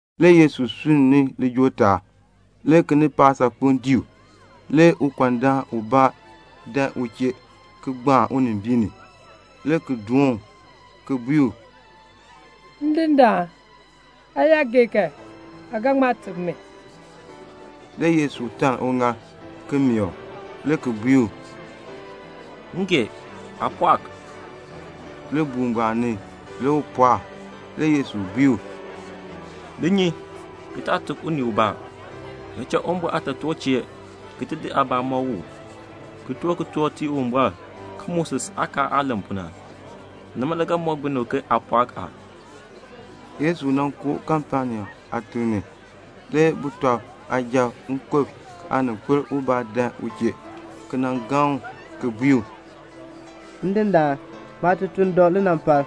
Le Yesu sunn ni lijool taab. Le kinipaak saakpeŋ dii u. Le ukɔndaan dan u chee le ki gbaan unimbiin ni, le ki doon u, le ki bui u, "Ndindaan, aa yaa gee kan, aa ga ŋma teb mi." Le Yesu taln uŋaal, ki meeh u, le ki bui u, "M gee. Aa pɔɔk." Libuul ngbaan ni le u pɔɔk. Le Yesu bui u, "Li nyi, ki taa tuk unii ubaa. Li cha Uwumbɔr aatotoor chee ki di aabaa ki di mɔk u, ki toor kitork ki tii Uwumbɔr ke Moses aakaal aah len pu na. Nima le ga mɔk binib ke aa pɔɔk a." Le Yesu koo Kapenaum aatiŋ ni. Le sujatiib nkub aaninkpil dan u chee ki gaŋ u ki bui u, "Ndindaan, maatutuln dɔ linampal.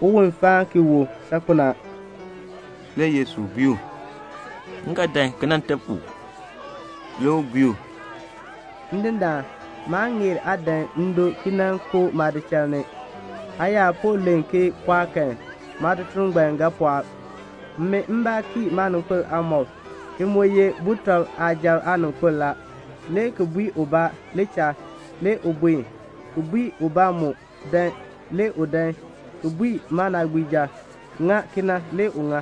Uwon faan ki wu saakpen a." Le Yesu bui u, "M ga dan ki nan teb u." Le u bui u, "Ndindaan, maa ŋeer aa dan ndo ki koo maadiik ni. Aa yaa po len ke 'Pɔɔk' kan, maatutuln ngbaan ga pɔɔk. Min mbaa kii maaninkpil aamɔb, ki mu ye sujatiib aaninkpil la, le ki bui ubaa, 'Li cha,' le u buen; le ki bui ubaa mu, 'Dan,' le u dan; le ki bui maanaagbiija, 'Ŋa kena,' le u ŋa."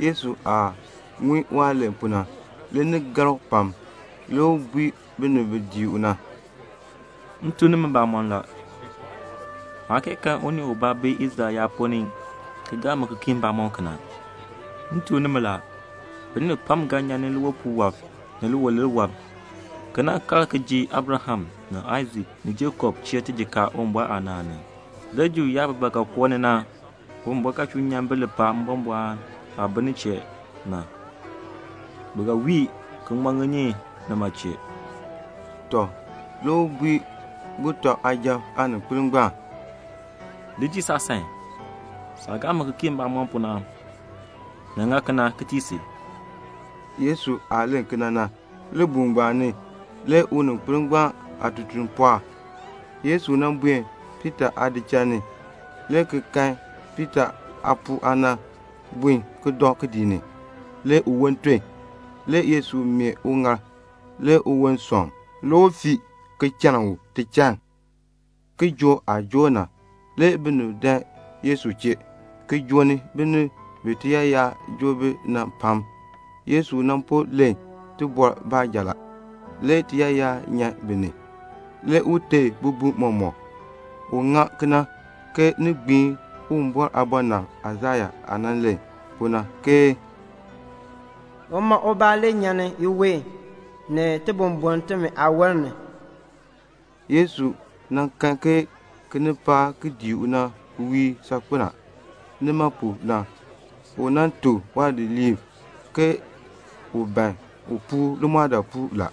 Yesu aah ŋun waah len kena na, le ni gar u pam. Le u bui binib bi dii u na, "M tuk nimi mbamɔn la, maa kee kan unii ubaa bi Israel yaab ponn ni ki gaa mi ki kii mbamɔm kena. M tuk nimi la, binib pam ga nyan ni liwipuul wɔb, ni liwilir wɔb, ki kal ki ji Abraham ni Aisak ni Jakob chee tijikaar Uwumbɔr aanaan ni. Le Juu yaab bi ba ga koo ni na, Uwumbɔr ga chuu nyan bi lipaal mbɔmbɔɔn aah bi nin chee na. Bi ga wii ki ŋman ŋinyin nima chee." Tɔ, le u bui sujatiib aaninkpil ngbaan, "Li dii saasan. Saah gaa mi ki kii mbamɔm pu na, ni ŋa kena ki tii si." Yesu aah len kena na, libuul ngbaan ni le uninkpil ngbaan aatutuln pɔɔk. Le Yesu buen Piita aadichal ni, le ki kan Piita aapuu aana bun ki dɔ kidiik ni. Le uwon ton. Le Yesu meeh uŋaal. Le uwon sɔŋ. Le u fii, le ki chann u tichann. Kijook aah joor na, le binib dan Yesu chee, ki joo ni binib pam bi tiyaayar joo bi na. Le Yesu po len, le tiyaayar nyan bi ni. Le u teei bibum mɔmɔk. U ŋa kena ke un gbiin Uwumbɔr aabɔnabr Aisaya aah nan len pu na, ke "Uma ubaa nyan ni iween, ni tibumbun timi aawon ni." Le Yesu kan ke kinipaak ki dii u na wiir saakpen a. Nima pu na le u tuk waadidiliib ke u ban un puur limɔɔdaapuul la.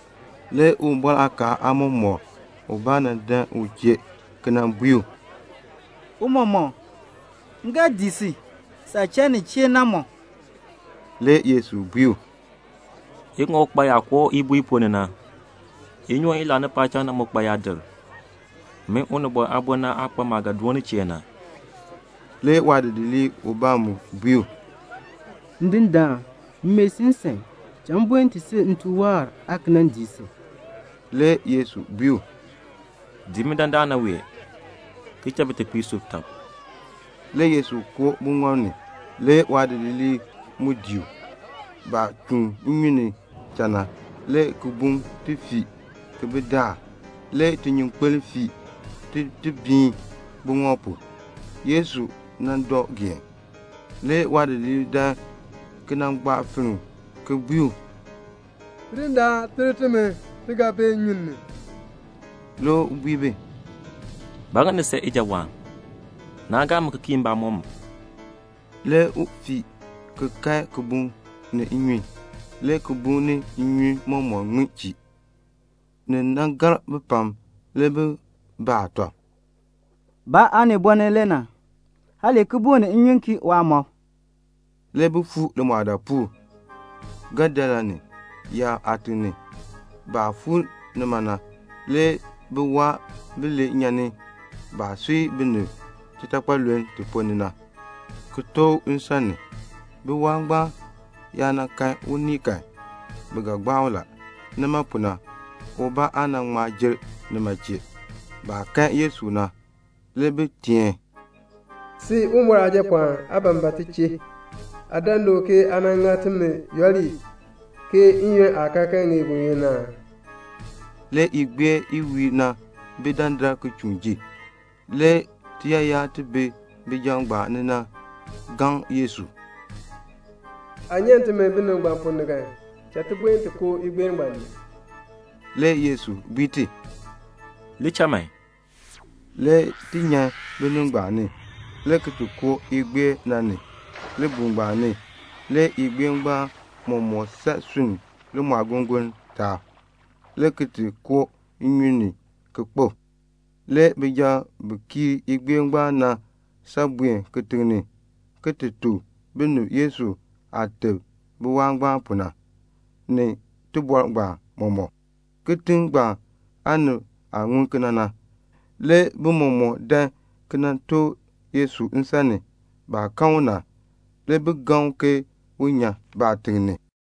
Le Uwumbɔr aakaal aamɔmɔkr ubaa nan dan u chee le ki bui u, "Tiicha, m ga dii si, saah cha nin chee na mɔk." Le Yesu bui u, "Iŋɔk kpa yaa koo ibuu i ponn ni na. Inyoon i laani paacham na mu kpa yaadir. Min Unibɔn Aabo aa kpa maah ga doon nin chee na." Le waadidiir ubaa mu bui u, "Ndindaan, m mee si nsan, cha m buen ti sub nte waahr, aan ki nan dii si." Le Yesu bui u, "Dii mi dandana wee, ki cha bitekpiib sub tɔb." Le Yesu koo buŋɔb ni. Le waadidiliib mu dii u. Baah chuun nnyun ni na le kibuŋ ti fii ki bi daar, le tinyunkpeln fii tin ti biin buŋɔb pu. Yesu dɔ geen la. Le waadidiliib dan ki nan gbaa finn u ki bui u, "Ndindaan, ter timi. Ti ga bee nnyun ni." Le u bui bi, "Ba ŋa ni san ijawaan? Naa gaa mi ki kii mbamɔm." Le u fii le ki kae kibuŋ ni nnyun. Le kibuŋ ni nnyun ŋmin chii. Le ni gar bi pam. Le bi baa tɔb, "Ba aaniboln le na? kibuŋ ni nnyun kii waamɔb." Le bi fuu limɔɔdaapuul, Gadarene yaab aatiŋ ni. Baah fuu nima na le biwaab bilee nyan ni baah sui binib titakpaluln ti ponn ni na, ki tooh u nsan ni. Biwaab ngbaan yaa kan unii kan, bi ga gbaa u la. Nima pu na, ubaa aa ŋma dii nima chee. Baah kan Yesu na, le bi teen, "Sin, Uwumbɔr Aajapɔɔn, aa ban ba ti chee? Aa dan du ke aa ŋa timi falaa n-yoonn aa kee ŋeer aa?" Le igbeer i wiir na bi dandar ki chuun ji. Le tiyaayar ti bi bijab ngbaan ni na gaŋ Yesu, "Aa yaa nyan timi binib ngbaan ponn ni kan, cha ti ti koo igbeer ngbaan ni." Le Yesu bui ti, "Li cha man." Le ti nyan binib ngbaan ni, le ki koo igbeer na ni. Libuul ngbaan ni, le igbeer mɔmɔk san sunni limɔɔgongoln taab, le ki koo nnyun ni ki kpo. Le bijab bi kiir igbeer ngbaan na san buen kitiŋ ni, le ki ti tuk binib Yesu aah teb biwaab ngbaan pu na, ni tibɔr ngbaan mɔmɔk. Kitiŋ ngbaan aanib aah ŋun kena na, le bi mɔmɔk dan ki nan tooh Yesu nsan ni. Baah kan u na, le bi gaŋni u ke un nyan baatiŋ ni.